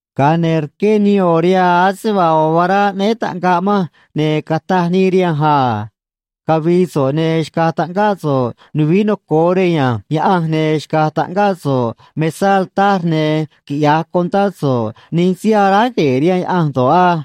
Ga̱a ne̱ rqué nii ꞌo̱ rihaa ase vaa ꞌo̱ vará aꞌnéé taꞌngaꞌ manj, ne̱ cataj nii rihanj a: ―Cavi̱i̱ so̱ꞌ ne̱ xca̱j taꞌngáꞌ so̱ꞌ nuvií noco̱o rej ya̱nj Yaꞌanj, ne̱ xca̱j taꞌngáꞌ so̱ꞌ mesá altar, ne̱ quiꞌya̱j contá so̱ꞌ nij síí aráj gue̱e̱ rihaan Yaꞌanj do̱ꞌ á.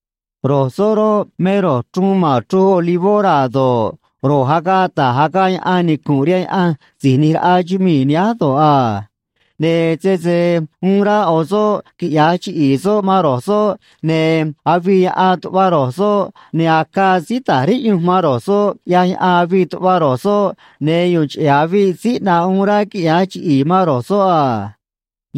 Ro̱j soꞌ roꞌ, me ro̱j chruun ma̱n chruj olivó raa̱ do̱ꞌ, ro̱j agaꞌ ta̱j agaꞌ yaꞌan nicu̱nꞌ rihaan Yaꞌanj Si̱j ꞌNi̱j Raꞌa chumii̱ nihánj do̱ꞌ a. Ne̱ sese uun rá ꞌo̱ soꞌ quiꞌya̱j chiꞌi̱i̱ soꞌ man ro̱j soꞌ, ne̱ avii yaꞌan tuꞌva ro̱j soꞌ, ne̱ acaa síí ta̱j riꞌyunj man ro̱j soꞌ, ꞌyaj yaꞌan avii tuꞌva ro̱j soꞌ, ne̱ yu̱u̱n cheꞌe̱ aviꞌ síí ꞌnaꞌ uun rá quiꞌya̱j chiꞌi̱i̱ man ro̱j soꞌ a.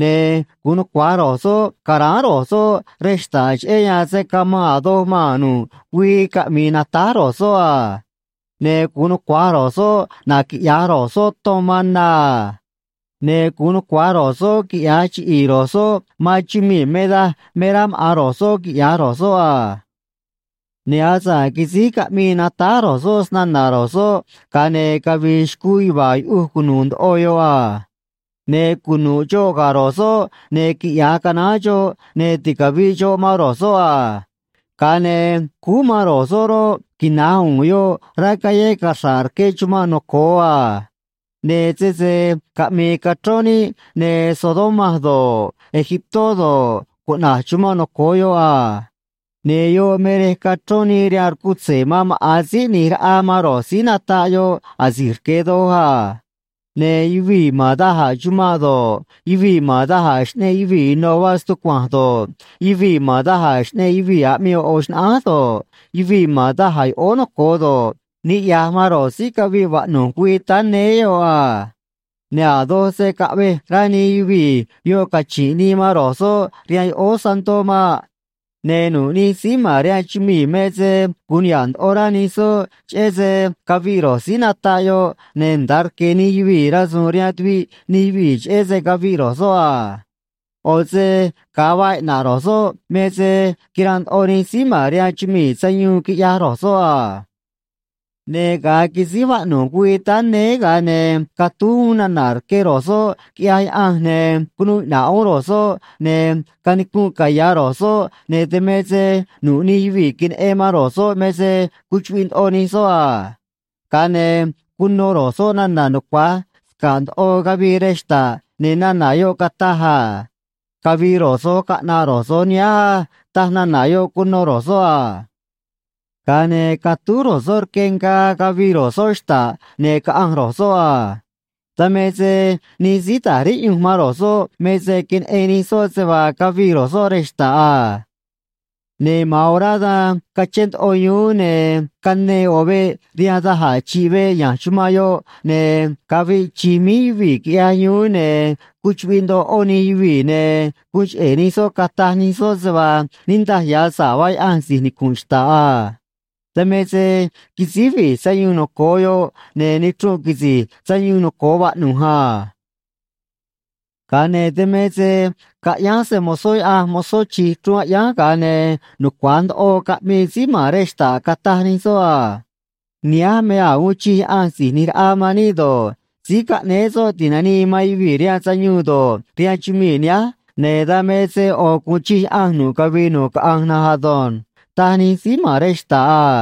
Ne̱ gu̱un nucua̱j ro̱j soꞌ ca̱ráán ro̱j soꞌ rej xta̱ꞌ, cheꞌé yan se̱ camanꞌ a̱ doj maa̱n nu̱ꞌ güii caꞌmi̱i̱ natáj ro̱j soꞌ a. Ne̱ gu̱un nucua̱j ro̱j soꞌ naquiꞌya̱j ro̱j soꞌ ton man na a. Ne̱ gu̱un nucua̱j ro̱j soꞌ quiꞌya̱j chiꞌi̱i̱ ro̱j soꞌ man chumii̱ me daj me rá maꞌa̱n ro̱j soꞌ quiꞌya̱j ro̱j soꞌ a. Ne̱ asa̱ꞌ quisíj caꞌmii natáj ro̱j soꞌ snana̱ ro̱j soꞌ, ga̱a ne̱ cavi̱i̱ xcuu yuva̱a̱ yuꞌuj cunu̱u̱ ndoꞌo yoꞌ a. Ne̱ cunu̱ꞌ xoꞌ ga̱ ro̱j soꞌ, ne̱ quiꞌya̱j canaán xoꞌ, ne̱ ticavi̱ꞌ xoꞌ man ro̱j soꞌ a. Ga̱a ne̱ cúú man ro̱j soꞌ roꞌ, quina̱j u̱u̱n yoꞌ rá callé caxra̱ꞌ rque chumanꞌ noco̱o a. Ne̱ sese caꞌmi̱i̱ cachrón níꞌ, ne̱ Sodoma do̱ꞌ, Egiptó do̱ꞌ, cuꞌna̱j chumanꞌ noco̱o yoꞌ a. Ne̱ yoꞌ me rej cachrón nii rihaan rcutze̱ man maꞌa̱n Síí ꞌNi̱j Raꞌa man ro̱j síí nataꞌ yoꞌ asi̱j rque̱ doj a. Ne̱ yuvii̱ ma̱n da̱j a̱ chumanꞌ do̱ꞌ, yuvii̱ ma̱n da̱j a̱ xꞌneꞌ yuvii̱ ino̱ vaa stucua̱nj do̱ꞌ, yuvii̱ ma̱n da̱j a̱ xꞌneꞌ yuvii̱ aꞌmii ꞌo̱ ꞌo̱ xnaꞌánj do̱ꞌ, yuvii̱ ma̱n da̱j a̱ yoꞌóó noco̱o do̱ꞌ, niꞌya̱j man ro̱j síí caviꞌ vaꞌnu̱j güii táá néé yoꞌ a. Ne̱ a̱ doj se̱ caꞌvej rá nij yuvii̱ yoꞌ cachi̱nꞌ nii man ro̱j soꞌ rihaan yoꞌóó santó maꞌ. Ne̱ nu̱ꞌ nij síí ma̱n rihaan chumii̱ me se gu̱un niha̱ꞌ ndoꞌo rá nij soꞌ cheꞌé se caviꞌ ro̱j síí nataꞌ yoꞌ, ne̱ nda̱a rque̱ nij yuvii̱ rasu̱u̱n rihaan tuviꞌ nij yuvii̱ cheꞌé se caviꞌ ro̱j soꞌ a. ꞌO̱ se ga̱a vaa iꞌna̱ꞌ ro̱j soꞌ me se quiranꞌ ndoꞌo nij síí ma̱n rihaan chumii̱ sayuun, quiꞌyaj ro̱j soꞌ a. Ne̱ ga̱a quisíj vaꞌnu̱j güii táá néé, ga̱a ne̱ catúj uún nana̱ rque ro̱j soꞌ, quiꞌyaj Yaꞌanj, ne̱ cunuu iꞌna̱ꞌ uún ro̱j soꞌ, ne̱ canicunꞌ caya̱ ro̱j soꞌ, ne̱ dan me se nu̱ꞌ nij yuvii̱ queneꞌen man ro̱j soꞌ me se cuchuꞌviꞌ ndoꞌo nij soꞌ a. Ga̱a ne̱ cuno ro̱j soꞌ nana̱ nucua̱j sca̱ꞌ ndoꞌo cavii rej xta̱ꞌ, ne̱ nana̱ yoꞌ cataj a: ―Cavi̱i̱ ro̱j so̱j caꞌna̱ꞌ ro̱j so̱j nihánj á ―taj nana̱ yoꞌ cuno ro̱j soꞌ a. Ga̱a ne̱ catúj ro̱j soꞌ rque ngaa, cavii ro̱j soꞌ xta̱ꞌ, ne̱ caꞌanj ro̱j soꞌ a. Dan me se nij síí ta̱j riꞌyunj man ro̱j soꞌ me se queneꞌen nij soꞌ se vaa cavii ro̱j soꞌ rej xta̱ꞌ a. Ne̱ ma̱an orá dan cachén ndoꞌo yuún, ne̱ canee ꞌo̱ veꞌ rihaan da̱j a̱ chi̱ꞌ veꞌ ya̱nj chumanꞌ yoꞌ, ne̱ caviꞌ chi̱j míj yuvii̱, quiꞌyaj yuún, ne̱ cuchuꞌviꞌ ndoꞌo ꞌó nij yuvii̱, ne̱ guun cheꞌe̱ nij soꞌ cataj nij soꞌ se vaa niꞌndaj ya̱ sa̱ꞌ vaa Yaꞌanj si̱j nicu̱nꞌ xta̱ꞌ a. Dan me se quisíj vi̱j sayuun noco̱o yoꞌ, ne̱ nichrunꞌ quisi̱j sayuun noco̱o vaꞌnu̱j a. Ga̱a ne̱ dan me se caꞌyánj se‑mo̱zó Yaꞌanj mozó chi̱j chruun aꞌyánj, ga̱a ne̱ nucua̱j ndoꞌo caꞌmii síí ma̱n rej xta̱ꞌ, cataj nij soꞌ a: Nihánj me a̱j uun chij Yaꞌanj Si̱j ꞌNi̱j Raꞌa man níꞌ do̱ꞌ, Síí Caꞌnéé Soꞌ Ti̱nanii man Yuvii̱ rihaan Sayuun do̱ꞌ, rihaan chumii̱ nihánj, ne̱ dan me se ꞌo̱ gu̱un chij Yaꞌanj nu̱ꞌ cavii nu̱ꞌ caꞌanj na̱nj ado̱nj, taj nij síí ma̱n rej xta̱ꞌ a.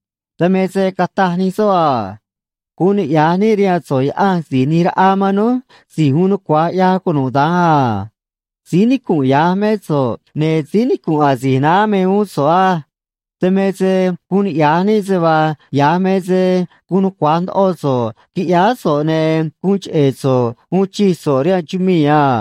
Dan me se cataj nij soꞌ a: Guun niꞌya̱j níꞌ rihaan so̱ꞌ, Yaꞌa̱nj Si̱j ꞌNi̱j Raꞌa man núj, Si̱j Uun Nucua̱j ꞌYaj Cunuda̱nj a. Síí nicu̱nꞌ ya̱j mé so̱ꞌ, ne̱ síí nicu̱nꞌ asi̱j naá me uún so̱ꞌ á. Dan me se guun niꞌya̱j níꞌ se vaa ya̱j me se guun nucua̱j ndoꞌo so̱ꞌ, quiꞌyáá so̱ꞌ, ne̱ guun cheꞌe̱ so̱ꞌ uun chij so̱ꞌ rihaan chumii̱ a.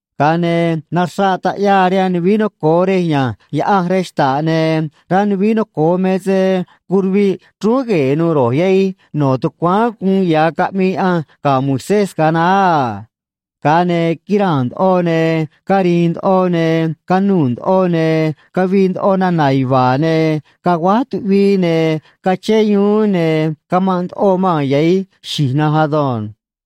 Ga̱a ne̱ naxraꞌ taꞌyaa rihaan nuvií noco̱o rej ya̱nj Yaꞌanj rej xta̱ꞌ, ne̱ rá nuvií noco̱o me se curuviꞌ chrúún gue̱e̱ nu̱u̱ ro̱j yahij no̱ tucuáán guun ya̱ caꞌmii Yaꞌanj ga̱ Moisés ga̱a naá a. Ga̱a ne̱ quiraa̱n ndoꞌo, ne̱ cari̱i̱n ndoꞌo, ne̱ canuu̱ ndoꞌo, ne̱ cavii ndoꞌo nana̱ yuva̱a̱, ne̱ caguáj tuꞌvii, ne̱ cachén yuún, ne̱ camanꞌ ndoꞌo maa̱n yahi̱j xi̱j na̱nj ado̱nj.